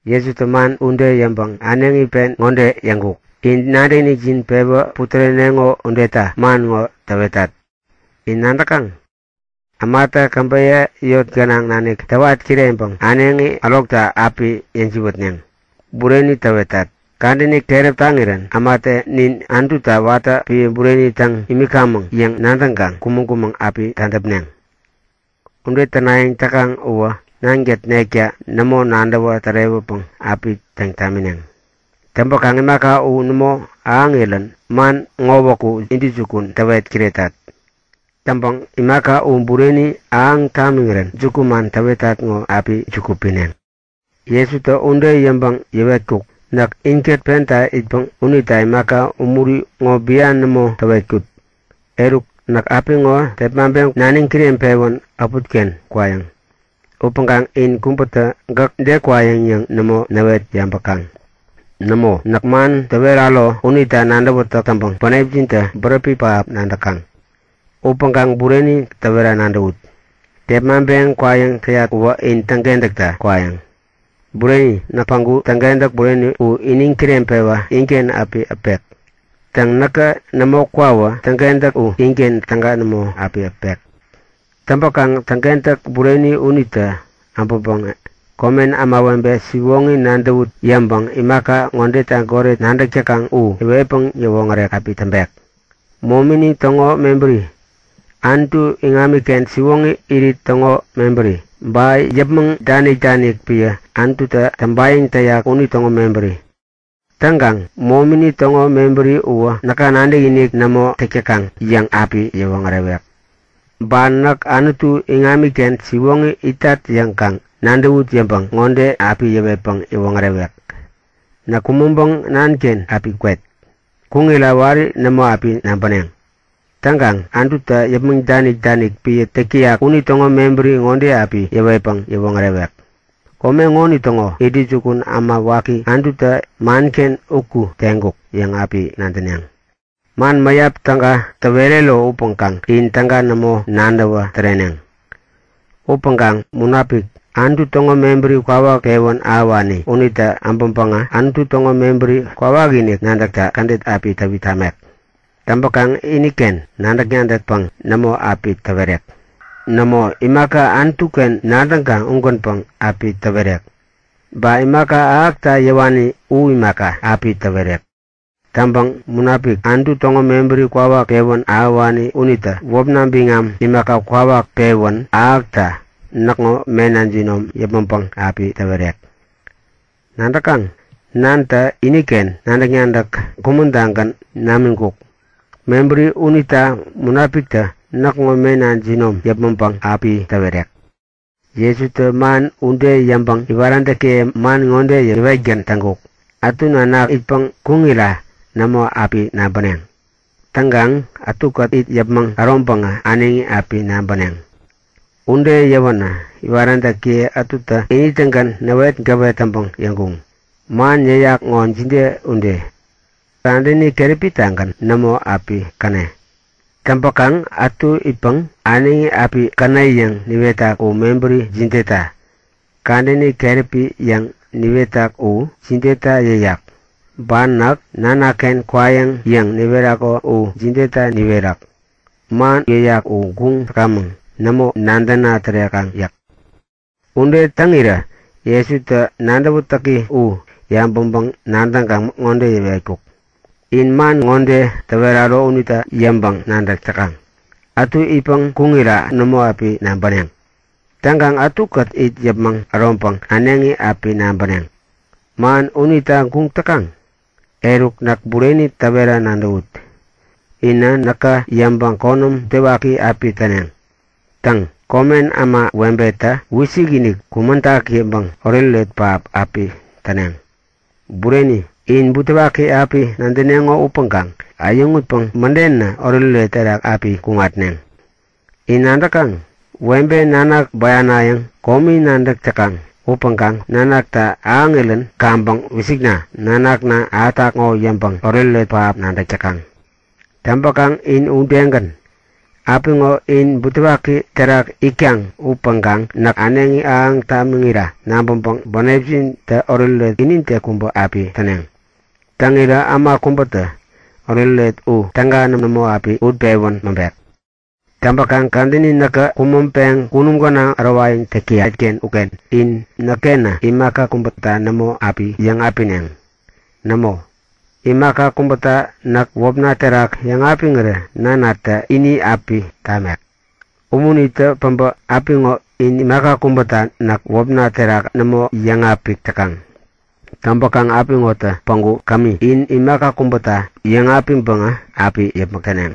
Jesutä man ude yäŋpäŋ äneŋi pen ŋode yäŋkuk; In nadäkinikjin pewä putäreneŋo udeta man ŋo täwetat. In nadäkaŋ? Ämatä käbeyä yot gänaŋ nanik täwat kireŋpäŋ äneŋi ärokta api yäjiwätneŋ. Bureni täwetat, kadäni keräp taŋirän ämatä nin Anututa watä epän bureni täŋ imikamäŋ yäŋ nadäŋkaŋ kumäŋ-kumäŋ api tadäpneŋ. Ude tänayäŋ täkaŋ uwä Nankät nekta nämo nadäwä tärewäpäŋ api täŋ tamineŋ. Täŋpäkaŋ imaka u nämo ahäŋirän man ŋowäku intäjukun täwet kiretat. Täŋpäŋ imaka u bureni ahäŋ tamiŋirän jukuman täwetat ŋo api juku pineŋ. Jesutä ude yäŋpäŋ yäwetkuk; Näk inkät penta itpäŋ unita imaka umuri ŋo bian nämo täwetkut. Eruk, näk apiŋo tepmaŋpeŋ naniŋ kireŋpewän äputken kwayäŋ. Upäŋkaŋ in kubätä gäk de kwayäŋ yäŋ nämo näwet yabäkaŋ. Nämo, näk man täweraro unita nadäwätäk täŋpäŋ bänepjintä bäräpi pähap nadäkaŋ. Upäŋkaŋ bureni täwera nadäwut; Tepmaŋpeŋ kwayäŋ täyat uwä in täŋkentäkta kwayäŋ. Bureni, näk päŋku Täŋkentäk u iniŋ kireŋpewa inken api äpek. Täŋ, näkä nämo kwawä Täŋkentäk u inken täga nämo api äpek. Täŋpäkaŋ Täŋkentäk unitä äbäŋpäŋä komen ämawebe siwoŋi nadäwut yäŋpäŋ imaka ŋodeta goret nadäk täkaŋ u yäwetpäŋ yäwoŋärek api täŋpek; Momini täŋo mebäri, Anutu iŋamiken siwoŋi irit täŋo mebäri, ba yäpmäŋ danik-danik epän Anututä täŋpayäŋ täyak unitäŋo mebäri. Täŋkaŋ momini täŋo mebäri uwä näka nadäkinik nämo täk täkaŋ yäŋ api yäwoŋärewek. Ba näk Anutu iŋamiken siwoŋi itat yäŋ kaŋ nadäwut yäŋpäŋ ŋode api yäwetpäŋ yäwoŋärewek; Näk kumäŋpäŋ Nanken api kwet. Kuŋira wari nämo api nabäneŋ. Täŋkaŋ Anututä yäpmäŋ danik-danik epän täk täyak unitäŋo mebäri ŋode api yäwetpäŋ yäwoŋärewek; Kome ŋonitäŋo intäjukun äma waki Anututä manken uku teŋkuk yäŋ api nadäneŋ. Man mäyap täga täwerero upäŋkaŋ in täga nämo nadäwä täreneŋ. Upäŋkaŋ Munapik, Anutu täŋo mebäri kwawak pewän ahäwani unitä äbäŋpäŋä Anutu täŋo mebäri kwawakinik nadäkta kädet api täwit tamek. Täŋpäkaŋ iniken nadäk-nadäkpäŋ nämo api täwerek. Nämo, imaka Anutu-ken nadäŋkaŋ ugänpäŋ api täwerek. Ba imaka ahäkta yäwani u imaka, api täwerek. Täŋpäŋ Munapik, Anutu täŋo mebäri kwawak pewän ahäwani unitä wäpna biŋam imaka, kwawak api pewän ahäneŋ. Ude täkta näkŋo mena jinom yäpmäŋpäŋ api täwerek. Nadäkaŋ? Nanatä iniken nadäk-nadäk kumän-tagän namiŋkuk. Mebäri unita Munapiktä näkŋo mena jinom yäpmäŋpäŋ api täwerek. Jesutä man ude yäŋpäŋ iwaräntäkiye man ŋode yäwetgän täŋkuk; Ätu nanak itpäŋ kuŋira nämo api nabäneŋ. Täŋkaŋ ätukät it yäpmäŋ äroŋpäŋä äneŋi api nabäneŋ. Ude yäwänä iwaräntäkiye ätutä ini-tägän näwetgäwet täŋpäŋ yäŋkuŋ; Man yäyak ŋo jide ude? Kadäni keräpi-tagän nämo api käne. Täŋpäkaŋ ätu itpäŋ äneŋi api käne yäŋ niwetak u mebäri jideta? Kadäni keräpi yäŋ niwetak u jideta yäyak? Ba Näk Nanaken kwayäŋ yäŋ niwerako u jideta niwerak? Man yäyak u guŋ täkamäŋ. Nämo nadäna tärekaŋ yäk. Ude täŋirä Jesutä nadäwätäki u yabäŋpäŋ-nadäŋkaŋ ŋode yäwetkuk; In man ŋode täweraro unita yäŋpäŋ-nadäk täkaŋ?; Ätu itpäŋ kuŋira nämo api nabäneŋ. Täŋkaŋ ätukät it yäpmäŋ äroŋpäŋ äneŋi api nabäneŋ. Man unita guŋ täkaŋ? Eruk, näk bureni täwera nadäwut; Inä näka yäŋpäŋ konäm butewaki api täneŋ. Täŋ, komen ämawebetä wisikinik, kumäŋtak yäŋpäŋ oretoret pähap api täneŋ. Bureni, in butewaki api nadäneŋo upäŋkaŋ äyäŋutpäŋ mädenä oretoret terak api kuŋatneŋ. In nadäkaŋ? Webe nanak bäyanayäŋ komi nadäk täkaŋ. Upäŋkaŋ nanaktä ahäŋirän kaŋpäŋ Wisikna, nanakna ahätak ŋo yäŋpäŋ oretoret pähap nadäk täkaŋ. Täŋpäkaŋ in udegän. Apiŋo in butewaki terak itkaŋ upäŋkaŋ näk äneŋi ahäŋ tamiŋira nabäŋpäŋ bänepjintä oretoret inide kubä api täneŋ. Täŋirä äma kubätä oretoret u täga nämo api utpewän mäŋpek. Täŋpäŋ kadäni näkä kumäŋpeŋ kunum gänaŋ ärowayäŋ täyat-ken uken in näk-kenä imaka kubäta nämo api yäŋapineŋ. Nämo, imaka kubäta näk wäpna terak yäŋapiŋirä Nanatä ini api tamek. Umunitä päbä apiŋo in imaka kubäta näk wäpna terak nämo yäŋapik täkaŋ. Täŋpäkaŋ apiŋotä päŋku kämi, in imaka kubäta yäŋapiŋpäŋä api yäpmäk täneŋ.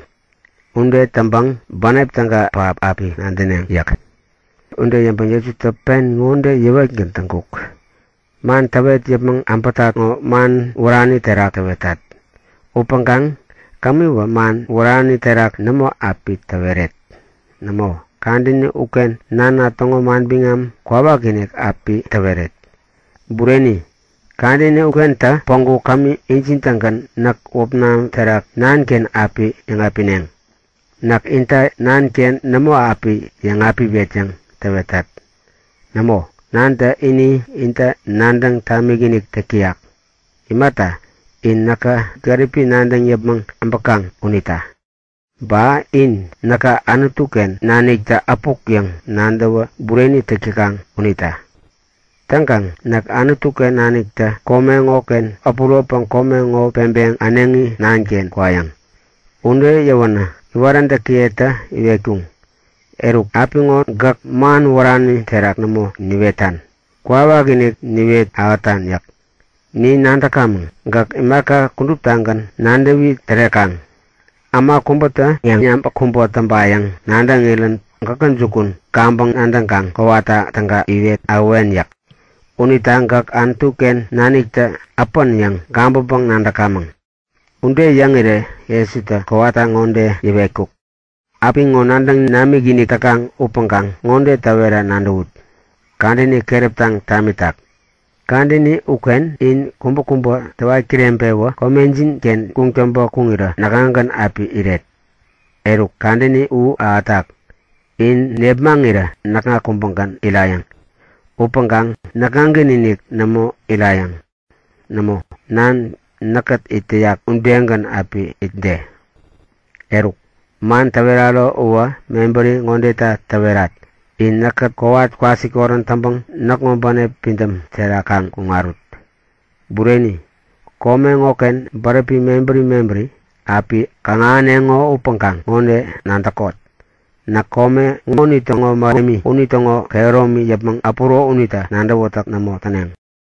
Ude täŋpäŋ bänep täga pähap api nadäneŋ yäk. Jesutä ude yäŋpäŋ pen ŋode yäwetgän täŋkuk; Man täwet yäpmäŋ äbätat ŋo man wärani terak täwetat. Upäŋkaŋ kämiwä man wärani terak nämo api täweret. Nämo, kadäni uken Nana täŋo manbiŋam kwawakinik api täweret. Bureni, kadäni ukentä päŋku kämi injin-tägän näk wäpna terak Nanken api yäŋapineŋ. Näk inta Nanken nämo api yäŋapiwet yäŋ täwetat. Nämo, Nantä ini inta nadäŋ tamikinik täk täyak. Imata, in näka gäripi nadäŋ yäpmäŋ äbäkaŋ unita. Ba in näka Anutu-ken naniktä äpuk yäŋ nadäwä bureni täk täkaŋ unita. Täŋkaŋ näk Anutu-ken naniktä kome ŋoken äpuropäŋ kome ŋo peŋpeŋ äneŋi Nanken kwayäŋ. Ude yäwänä iwaräntäkiyetä iwetkuŋ; Eruk, apiŋo gäk man wärani terak nämo niwetan. Kwawakinik niwet ahätan yäk. Nin nadäkamäŋ, gäk imaka kuduptagän nadäwi tärekaŋ. Äma kubätä yäŋyabäk kubä täŋpayäŋ nadäŋirän gäkä jukun kaŋpäŋ nadäŋkaŋ kowata täga iwet ahäwen yäk. Unita gäk Anutu-ken naniktä äpän yäŋ gabäŋpäŋ-nadäkamäŋ. Ude yäŋirä Jesutä kowata ŋode yäwetkuk; Apiŋo nadäŋ namikinik täkaŋ upäŋkaŋ ŋode täwera nadäwut; Kadäni keräptaŋ tamitak. Kadäni uken in kubäkubä täwat kireŋpewä komejin-ken kuŋtäŋpä kuŋirä näkŋagän api iret. Eruk, kadäni u ahätak! In nepmaŋirä näkŋa kubägän irayäŋ. Upäŋkaŋ näkŋagän-inik nämo irayäŋ. Nämo, Nan näkkät it täyak udegän api itde. Eruk, man täweraro uwä mebäri ŋodeta täwerat; In näkkät kowat kwasikorän täŋpäŋ näkŋo bänep pidäm terak kaŋ kuŋarut. Bureni, kome ŋoken bäräpi mebäri mebäri api kaŋ-ahäneŋo upäŋkaŋ ŋode nadäkot; Näk kome ŋonitäŋo mähemi unitäŋo kehäromi yäpmäŋ äpäro unita nadäwätäk nämo täneŋ!